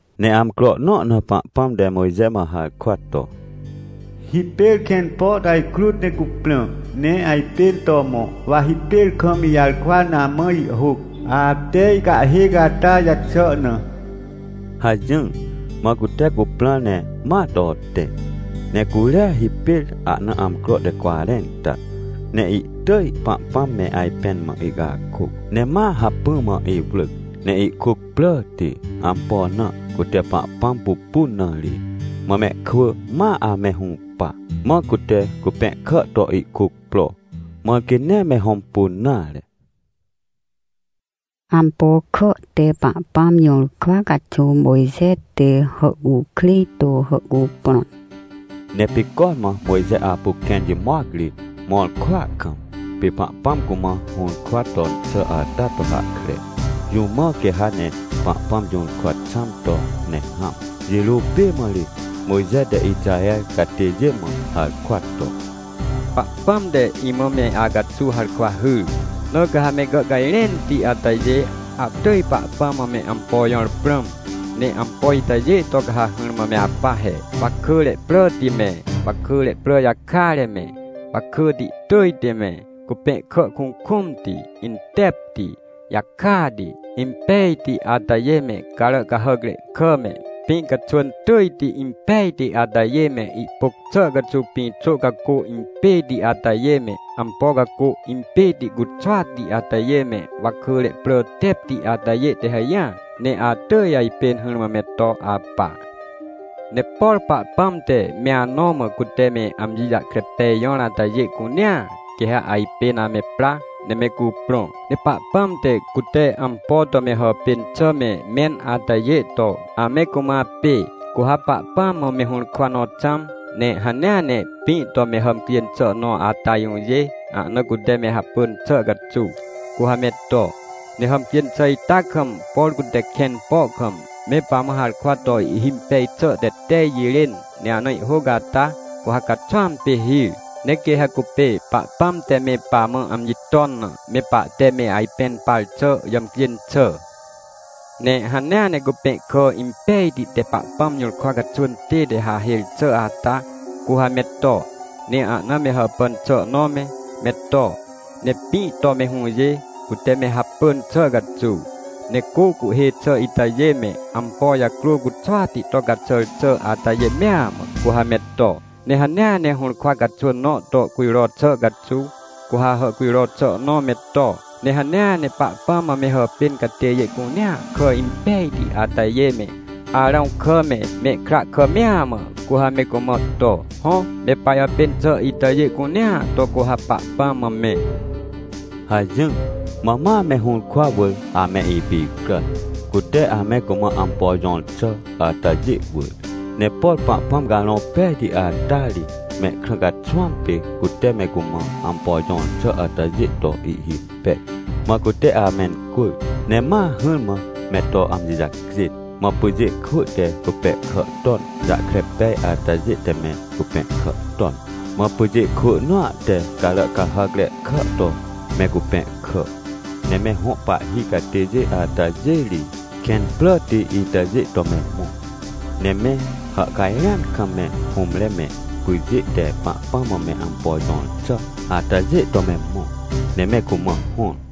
Ne amcro nõ na Pahpãm te Mojxe mã harkwa to: — Hipêr kẽn po to ajkrut ne cuprã, ne ajpên to mõ, wa hipêr kam ijarkwa na amã ihhôc, ate ihcahhêc ata jaxà na — hajỹr. Mã cutecuprãr ne ma to tẽ, ne curia hipêr ahna amcro te cwarẽnta. Neihtỳj Pahpãm me ajpẽn mã ihcakôc. Ne ma hacpỹ mã iwrỳc ne ihkuc pràti. Ampo na? Cute Pahpãm pupun na ri. Mã mehkwỳ ma ame hũpa, mãcute cupẽhkà to ihkuc pro, mãr quê nee me hõmpun nare. Ampo kà te Pahpãm jũrkwa caxuw Mojxe te hàhcukrêj to hàhcuprõn Ne pê cormã Mojxe apu kẽn jimoc ri mõr kwỳa kam, pê Pahpãm cumã hũrkwaton xà ata to hahkre, jũ mã quê ha ne Pahpãm jũrkwa xãm to ne hãm. Jirô pê mã ri Mojxe te Ixaher catêjê mã harkwa to: — Pahpãm te imã me acaxuw harkwa hyr. Na ca ha me gàhcajrẽnti atajê, atỳj Pahpãm mã meampo jõr prãm, ne ampo itajê to ca ha hỹrmã me apa he, wakỳre pràti me, wakỳre prà jakare me, wakỳti tỳjti me, cupẽhkàkukũmti, intepti, jakati, impejti atajê me, carà cahàcre kà me, pĩ caxwỳn tỳjti impejti atajê me, ihpôc xà caxuw pĩ xô cacô impêti atajê me, ampo cacô impêti cuxwati atajê me, wakỳre prà teptiatajê te hajỹar. Ne atỳj ajpên hỹrmã me to apa. — Ne por Pahpãm te me anõ mã cute me amji jahkre pej jõr atajê cunea, quê ha ajpên ame pra, ne me cuprõ. NePahpãm te, cute ampo to me hàpên xà me mẽn atajê to, ame cumã apê. Cu ha Pahpãm mã mehũrkwa nõ xãm, ne hanea ne pĩ to me hàmcjên xà nõ ata jũjê, ahna cute me hapỳn xà caxuw, cu ha me to. Ne hàmcjên xà ita kam, por cute kẽn po kam, me pamã harkwa to ihhimpej xà te tej jirên, ne ahna ihhôc ata, cu ha caxwãm pê hir. Ne quê ha cupê Pahpãm te me pamã amji ton na, me pahte me ajpẽn par xà jàmcjên xà. — Ne hanea ne cupẽhkà impejti te Pahpãm jũrkwa caxwỳntête hahêr xà ata, cu ha me to, ne ahname hàpàn xà nõ me, me to, ne pĩ to mehũjê, cute me hapỳn xà caxuw. Ne cô cuhhê xàitajê me, ampo jacrô cuxwati tocaxàr xà atajê mea mã, cu ha me to. Ne hanea ne hũrkwa caxwỳn nõ to cujro xà caxuw, cu ha hàhcujro xà nõ me to. — Ne hanea ne Pahpãm mã me hàpên catêjêcunea kà impejti atajê me, Arãw kà me, mehkra kà mea mã, cu ha me cumã to. Hõ, me pajàpên xà itajê cunea to, cu ha Pahpãm mã me — hajỹr. Mã ma me hũrkwa wỳr ame ipicràn, cute ame cumã ampo jõr xà atajê wỳr. Ne por Pahpãm Carõ Pejti ata ri mehkrã caxwãm pê cute mecumã ampo jõr xà atajê to ihhimpej. Mã cute amencwỳr, ne ma hỹrmã me to amji jacjên. Mã pyjê kwỳ te cupẽhkà ton jahkre pej atajê te me cupẽhkàton. Mã pyjê kwỳ nõa te carà cahàcre kà to me cupẽhkà. Ne me hõ pahhicatêjê atajê ri kẽn pràti itajê to me mõ. Neme hàhcajrẽan kam me hũmre mepyjê te Pahpãm mã me ampo jõr xà atajê to me mõ, ne me cumã hõr.